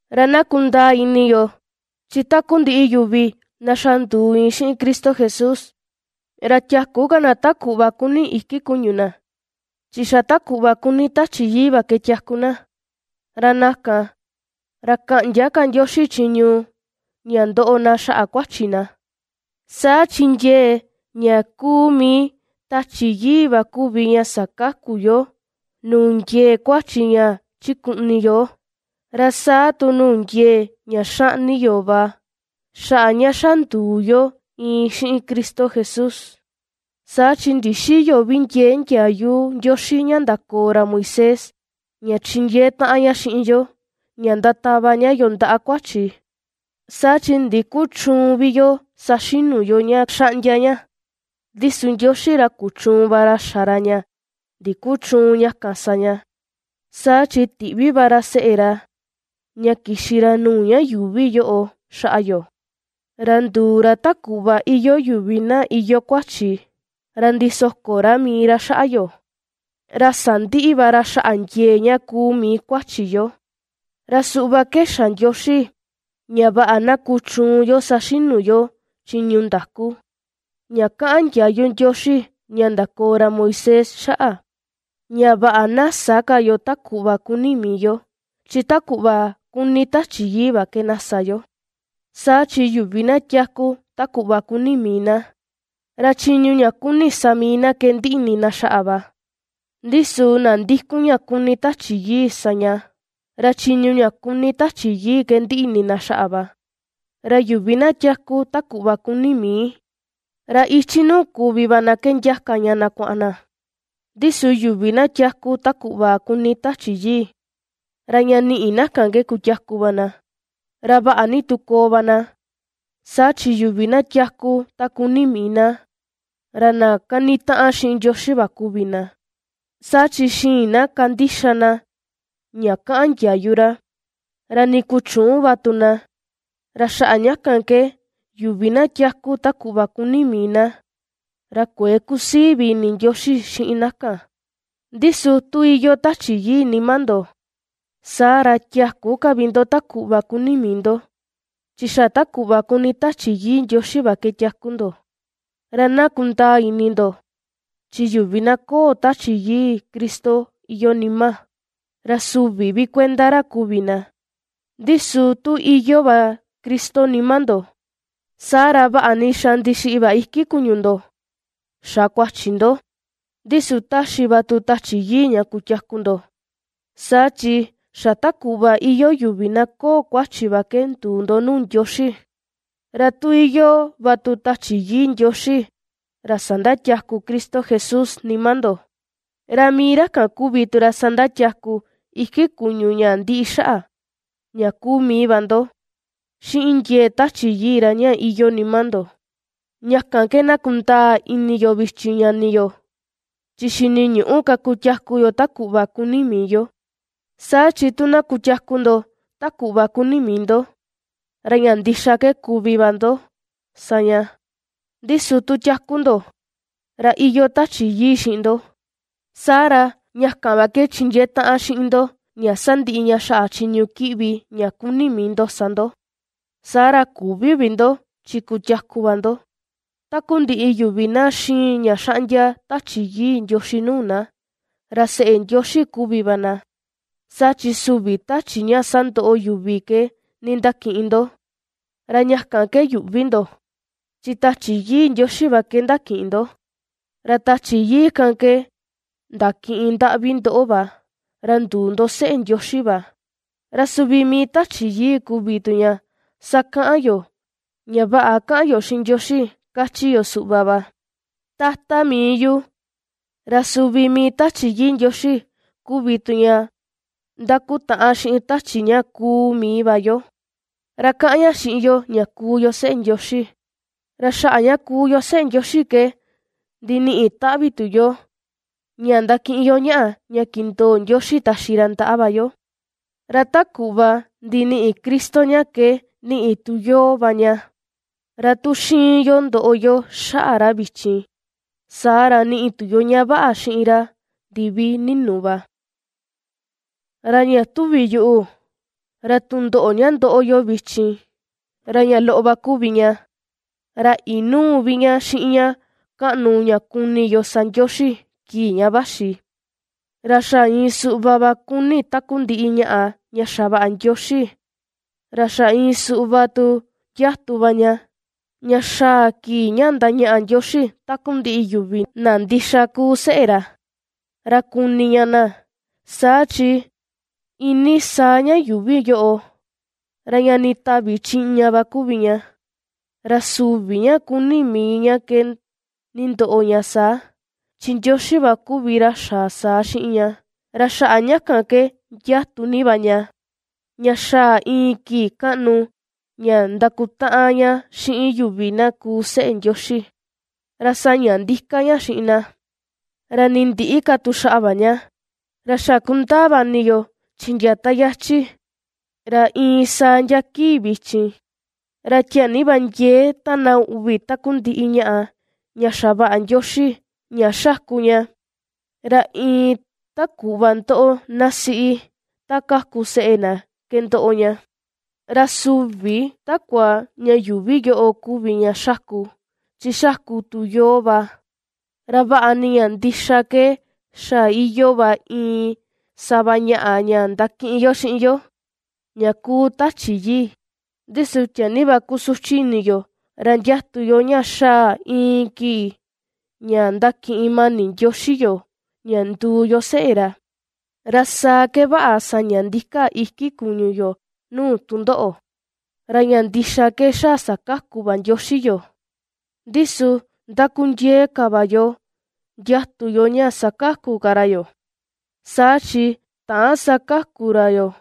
Ra na kundaa ini yo, chi takundiꞌi yuvi na ^xa nduu iin xiꞌin Cristo Jesús, ra tiäku ka na ta kuꞌva kuni iki kuñu na, chi xa ta kuꞌva kuni Tachi Yii va ke tiaku na; ra na kan, ra käꞌndia ka Ndioxi chiñu ña ndoꞌo na xaꞌa kuachi na. Saa chi ndiee ña kuu mii Tachi Yii va kuvi ña sakaku yoo nuu ndiee kuachi ña chikuꞌni yoo, ra saa tu nuu ndiee ña xaꞌni yoo va, xaꞌa ña xa nduu yo iin xiꞌin Cristo Jesús. Saa chi ndixïyo vi ndiee ndiayu Ndioxi ña ndakoo ra Moisés ña chindiee taꞌan ña xiꞌin yo, ña ndatava ña yoo ndaꞌa kuachi, saa chi ndikuchüun vi yo saxinu yo ña xaꞌndia ña, ndi su Ndioxi ra kuchuun va ra xa ra ña ndikuchüun ña kan sa ña. Saa chi tiꞌvi va ra seꞌe ra ña kixi ra nuu ña yuuvi yoꞌo xaꞌa yo, ra nduu ra ta kuꞌva iyoo yuvi na iyoo kuachi, ra ndisoko ra mii ra xaꞌa yo, ra sandiꞌi va ra xaꞌa ndiee ña kuu mii kuachi yo. Ra suꞌva ke xa Ndioxi ña vaꞌa na kuchuun yo saxinu yo chiñu ndaku, ña kaꞌan ndiayu Ndioxi ña ndakoo ra Moisés xaꞌa, ña vaꞌa na sä ka yo ta kuꞌva kuni mii yo, chi ta kuꞌva kuni Tachi Yii va ke na sa yo. Saa chi yuvi na tiaku ta kuni mii na, ra chiñu ña kuni mii na sa na ke ndiꞌi ini na xaꞌa va, ndi su na ndikun ña kuni Tachi Yii sa ña, ra chiñu ña kuni Tachi Yii ke ndiꞌi ini na xaꞌa va. Ra yuvi na tiaku ta kuꞌva kuni mii, ra ichi nuu kuvi va na ke ndiaka ña na kuaꞌan na, ndi su yuvi na tiaku ta kuꞌva kuni Tachi Yii, ra ña niꞌi na kan ke kutiaku va na, ra vaꞌa ni tu koo va na. Saa chi yuvi na tiaku ta kuni mii na, ra na kanitaꞌan xiꞌin Ndioxi va kuvi na; saa chi xïin na kandixa na ña kaꞌan ndiayu ra, ra nii kuchüun va tu na. Ra xaꞌa ña kan ke, yuvi na tiaku ta kuꞌva kuni mii na, ra kuëe kusii vi ini Ndioxi xiꞌin na kan. Ndi su tu iyoo Tachi Yii nima ndo, saa ra tiäku ka vi ndo ta kuꞌva kuni mii ndo, chi xa ta kuꞌva kuni Tachi Yii Ndioxi va ke tiaku ndo. Ra na kundaa ini ndo, chi yuvi na köo Tachi Yii Cristo iyoo nima, ra süvi vi kuenda ra kuvi na. Ndi su tu iyoo va Cristo nima ndo, saa ra, vaꞌa ni xa ndixiꞌi va iki kuñu ndo xa kuachi ndo, ndi su ^taxi va tu Tachi Yii ña kutiaku ndo, saa chi xa ta kuꞌva iyoo yuvi na köo kuachi va ke nduu ndo nuu Ndioxi. Ra tu iyoo va tu Tachi Yii Ndioxi ra sandatiaku Cristo Jesús nima ndo, ra mii ra kan kuvi tu ra sandatiaku iki kuñu ña ndiꞌi xaꞌa, ña kuu mii va ndo, xiꞌin ndiee Tachi Yii ra ña iyoo nima ndo. Ña kan ke na kundaa ini yo vichin ñani yo, chi xiniñüꞌu ka kutiaku yo ta kuꞌva kuni mii yo. Saa chi tu na kutiaku ndo ta kuꞌva kuni mii ndo, ra ña ndixa ke kuvi va ndo sa ña, ndi su tu ^tiaku ndo, ra iyoo Tachi Yii xiꞌin ndo, saa ra ña kan va ke chindiee taꞌan xiꞌin ndo ña sandiꞌi ña xaꞌa chiñu kiꞌvi ña kuni mii ndo sa ndo, saa ra küvi vi ndo, chi kutiaku va ndo. Takundiꞌi yuvi na xiin ña xaꞌndia Tachi Yii Ndioxi nuu na, ra seꞌe Ndioxi kuvi va na. Saa chi süvi tachi ña sandoꞌo yuvi ke nindakiꞌin ndo, ra ña kan yuꞌvi ndo, chi Tachi Yii Ndioxi va ke ndakiꞌin ndo, ra Tachi Yii kan ke ndakiꞌin ndaꞌvi ndoꞌo va, ra nduu ndo seꞌe Ndioxi va. Ra suvi mii Tachi Yii kuvi tu ña ^sakaꞌan yoo, ña vaꞌa ^kaꞌan yo xiꞌin Ndioxi kachi yo suꞌva va: “¡Tata mii yu!” Ra suvi mii Tachi Yii Ndioxi kuvi tu ña ndakutaꞌan xiꞌin tachi ña kuu mii va yo, ra kaꞌan ña xiꞌin yo ña kuu yo seꞌe Ndioxi. Ra xaꞌa ña kuu yo seꞌe Ndioxi ke ndiniꞌi taꞌvi tu yo ña ndakiꞌin yo ñaꞌa ña kindoo Ndioxi taxi ra ndaꞌa va yo. Ra ta kuꞌva ndiniꞌi Cristo ña ke niꞌi tu yoo va ña. Ra tu ^xiin yo ndoꞌo yo xaꞌa ra vichin, saa ra niꞌi tu yo ña vaꞌa xiꞌin ra ndivi ninu va. Ra ña tuvi yuꞌu, ra tundoꞌo ña ndoꞌo yo vichin, ra ña loꞌo va kuvi ña, ra inüu vi ña xiꞌin ña kaꞌnu ña kuni yo sa Ndioxi kii ña vaxi. Ra xa iin suꞌva va ^kuni takundiꞌi ñaꞌa ña xavaꞌa Ndioxi, ra xa iin suꞌva tu ndiatu va ña, ña xaa kii ña ndañaꞌa Ndioxi takundiꞌi yuvi na ndixa kuu seꞌe ra, ra kuni ña na. Saa chi iinii saa ña yuuvi yoꞌo, ra ña nditavi chiꞌña va kuvi ña, ra süvi ña kuni mii ña ke nindoꞌo ña saa, chi Ndioxi va kuvi ra xa saa xiꞌin ña. Ra xaꞌa ña kan ke ndiatu ni va ña, ña xaa iin kii kaꞌnu ña ndakutaꞌan ña xiꞌin yuvi na kuu seꞌe Ndioxi, ra saña ndika ña xiꞌin na, ra nii ndïꞌi ka tu xaꞌa va ña. Ra xa kundaa va ini yo, chi ndia ta yachi, ra iin saa ndia kii vichin, ra tiaa ni va ndiee ^tána uꞌvi takundiꞌi ñaꞌa, ña xavaꞌa Ndioxi ña xáku ña, ra iin ta kuꞌva ndoꞌo ná siꞌi ta kaku seꞌe na ke ndoꞌo ña. Ra süvi takua ña yuuvi yoꞌo kuvi ña xáku, chi xáku tu yoo va, ra vaꞌa ni ña ndixa ke xa iyoo va iin sava ñaꞌa ña ndakiꞌin yo xiꞌin yo, ña kuu Tachi Yii, ndi su tiaa ni va kusuchi ini yo, ra ndiatu yo ña xaa iin kii ña ndakiꞌin mani Ndioxi yoo ña nduu yo seꞌe ra, ra saa ke vaꞌa saña ndika iki kuñu yo nuu tundoꞌo. Ra ña ndixa ke xa sakaku va Ndioxi yoo, ndi su ndakundiee ka va yo ndiatu yo ña sakaku ka ra yoo. Saa chi täan sakaku ra yoo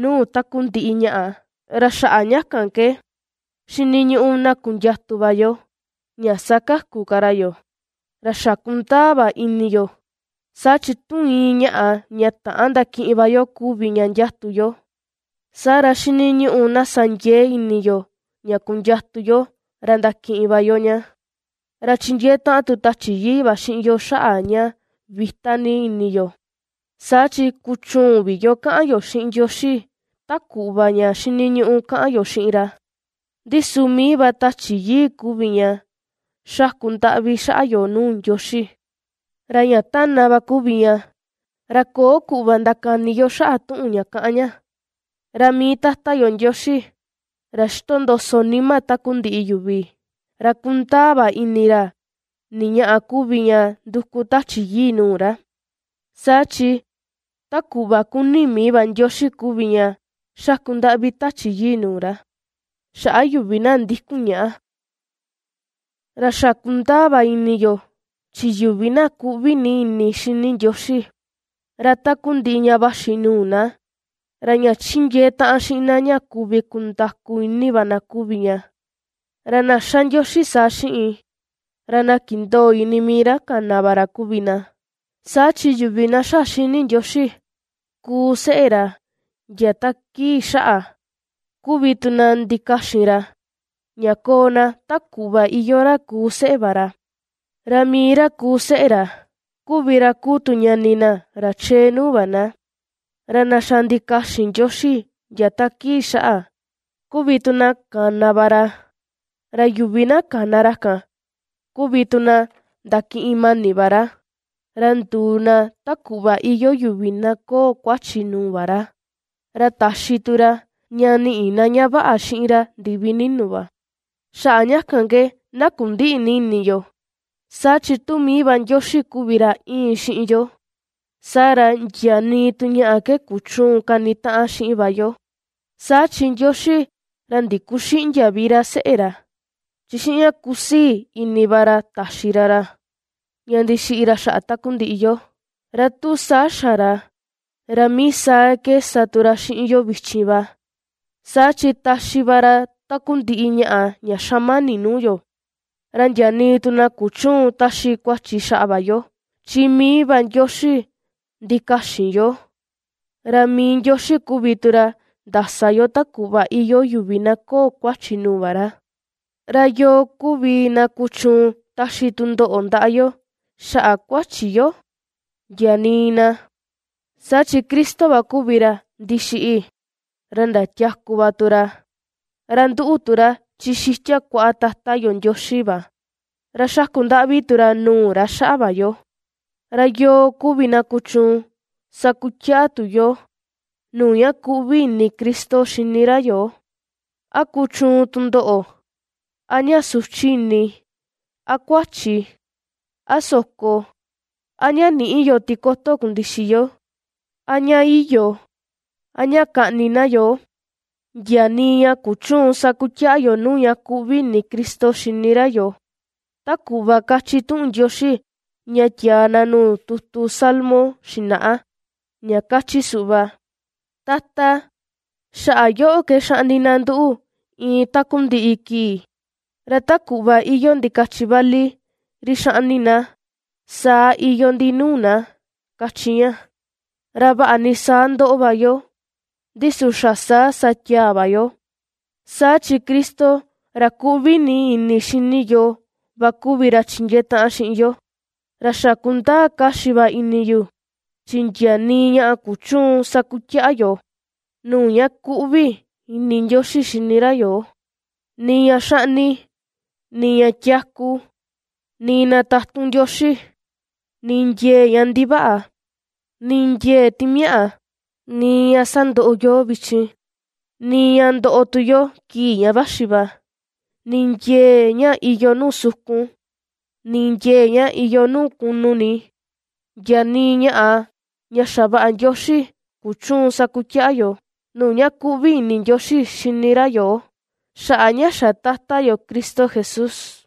nuu takundiꞌi ñaꞌa, ra xaꞌa ña kan ke, xiniñuꞌu na kundiatu va yo, ña sakaku ka ra yoo. Ra xa kundaa va ini yo, saa chi tu iin ñaꞌà ña täan ndakiꞌin va yo kuvi ña ndiatu yo, saa ra xiniñuꞌu na sa ndiee ini yo ña kundiatu yo, ra ndakiꞌin va yo ña. Ra chindiee taꞌan tu Tachi Yii va xiꞌin yo xaꞌa ña vita ni ini yo. Saa chi ^kuchüun vi yo kaꞌan yo xiꞌin Ndioxi ta kuꞌva ña xiniñuꞌu kaꞌan yo xiꞌin ra. Ndi su mii va Tachi Yii kuvi ña xaku ndaꞌvi xaꞌa yo nuu Ndioxi, ra ña ^tána va kuvi ña, ra köo kuꞌva ndakani yo xaꞌa tuꞌun ña kaꞌan ña. Ra mii Tata yo Ndioxi, ra ^xitondoso nima takundiꞌi yuvi, ra kundaa va ini ra ni ñaꞌa kuvi ña nduku Tachi Yii nuu ra; saa chi ta kuꞌva kuni mii va Ndioxi kuvi ña xaku ndaꞌvi Tachi Yii nuu ra, xaꞌa yuvi na ndikun ñaꞌa. Ra xa kundaa va ini yo, chi yuvi na kuꞌvi ni ini xini Ndioxi, ra takundiꞌi ña vaxi nuu na, ra ña chindiee taꞌan xiꞌin na ña kuvi kundaku ini va na kuvi ña. Ra na ^xa Ndioxi saa xiꞌin, ra na kindoo ini mii ra kana va ra kuvi na. Saa chi yuvi na xa xini Ndioxi ^kuu seꞌe ra ndia ta kii xaꞌa, kuvi tu na ndikaxin ra, ña koo na ta kuꞌva iyoo ra ^kuu seꞌe va ra; ra mii ra kuu seꞌe ra, kuvi ra kuu tu ñani na, ra chee nuu va na. Ra na xa ndikaxin Ndioxi ndia ta kii xaꞌa, kuvi tu na kana va ra, ra yuvi na kana ra kan kuvi tu na ndakiꞌin mani va ra, ra nduu na ta kuꞌva iyoo yuvi na köo kuachi nuu va ra, ra taxi tu ra ña niꞌi na ña vaꞌa xiꞌin ra ndivi ninu va. Xaꞌa ña kan ke na kundïꞌi ni ini yo, saa chi tu mii va Ndioxi kuvi ra íin xiꞌin yo, saa ra ndia nii tu ñaꞌa ke kuchüun kanitaꞌan xiꞌin va yo. Saa chi Ndioxi ra ndikuxïꞌndia vi ra seꞌe ra, chi xiꞌin ña kusii ini va ra taxi ra ra, ña ndixiꞌi ra xaꞌa takundiꞌi yo; ra tu saa xa ra, ra mii saa ke sa tu ra xiꞌin yo vichin va, saa chi taxi va ra takundiꞌi ñaꞌa ña xamani nuu yo. Ra ndia nii tu na kuchüun taxi kuachi xaꞌa va yo, chi mii va Ndioxi ndikaxin yoo. Ra mii Ndioxi kuvi tu ra ^ndasa yoo ta kuꞌva iyoo yuvi na köo kuachi nuu va ra. ¿Ra yoo kuvi na kuchuun taxi tundoꞌo ndaꞌa yo xaꞌa kuachi yo? Ndia nii na. Saa chi Cristo va kuvi ra ndixiꞌi; ra ndatiaku va tu ra, ra ^nduꞌu tu ra chi xitia kuaꞌa Tata yo Ndioxi va, ra ^xaku ndaꞌvi tu ra nuu ra xaꞌa va yo. ¿Ra yoo kuvi na kuchuun sakutiaꞌa tu yoo, nuu ña kuꞌvi ini Cristo xini ra yoo? ¿A kuchuun tundoꞌo, a ña suchi ini, a kuachi, a soko, a ña nïꞌi yo tikoto kundixi yo, a ña iyo, a ña kaꞌni na yoo? Ndia nii ña kuchüun sakutiaꞌa yoo nuu ña kuꞌvi ini Cristo xini ra yoo. Ta kuꞌva kachi tuꞌun Ndioxi ña tiaa na nuu tutu salmo xinaꞌa, ña kachi suꞌva: Tata, xaꞌa yoꞌo ke xaꞌni na nduꞌu iin takundiꞌi kii, ra ta kuꞌva iyoo ndikachi vali ri ^xaꞌni na, saa iyoo ndi nuu na, kachi ña. Ra vaꞌa ni saa ^ndoꞌo va yo, ndi su xa saa sa tiaa va yo, saa chi Cristo, ra ^kuꞌvi ni ini xini yoo va kuvi ra chindiee taꞌan xiꞌin yo. Ra xa kundaa kaxi va ini yu, chi ndia nii ñaꞌa kuchüun sakutiaꞌa yoo, nuu ña kuꞌvi ini Ndioxi xini ra yoo, nii ña xaꞌni, nii ña tiaku, nii na tatun Ndioxi, nii ndiee ña ndivaꞌa, nii ndiee timiaꞌa, nii ña ^sandoꞌo yoo vichin, nii ña ndoꞌo tu yo kii ña vaxi va, nii ndiee ña iyoo nuu sukun, nii ndiee ña iyoo nuu kunu ni, ndia nii ñaꞌa ña xavaꞌa Ndioxi kuchüun sakutiaꞌa yoo, nuu ña kuꞌvi ini Ndioxi xini ra yoo, xaꞌa ña xa Tata yo Cristo Jesús.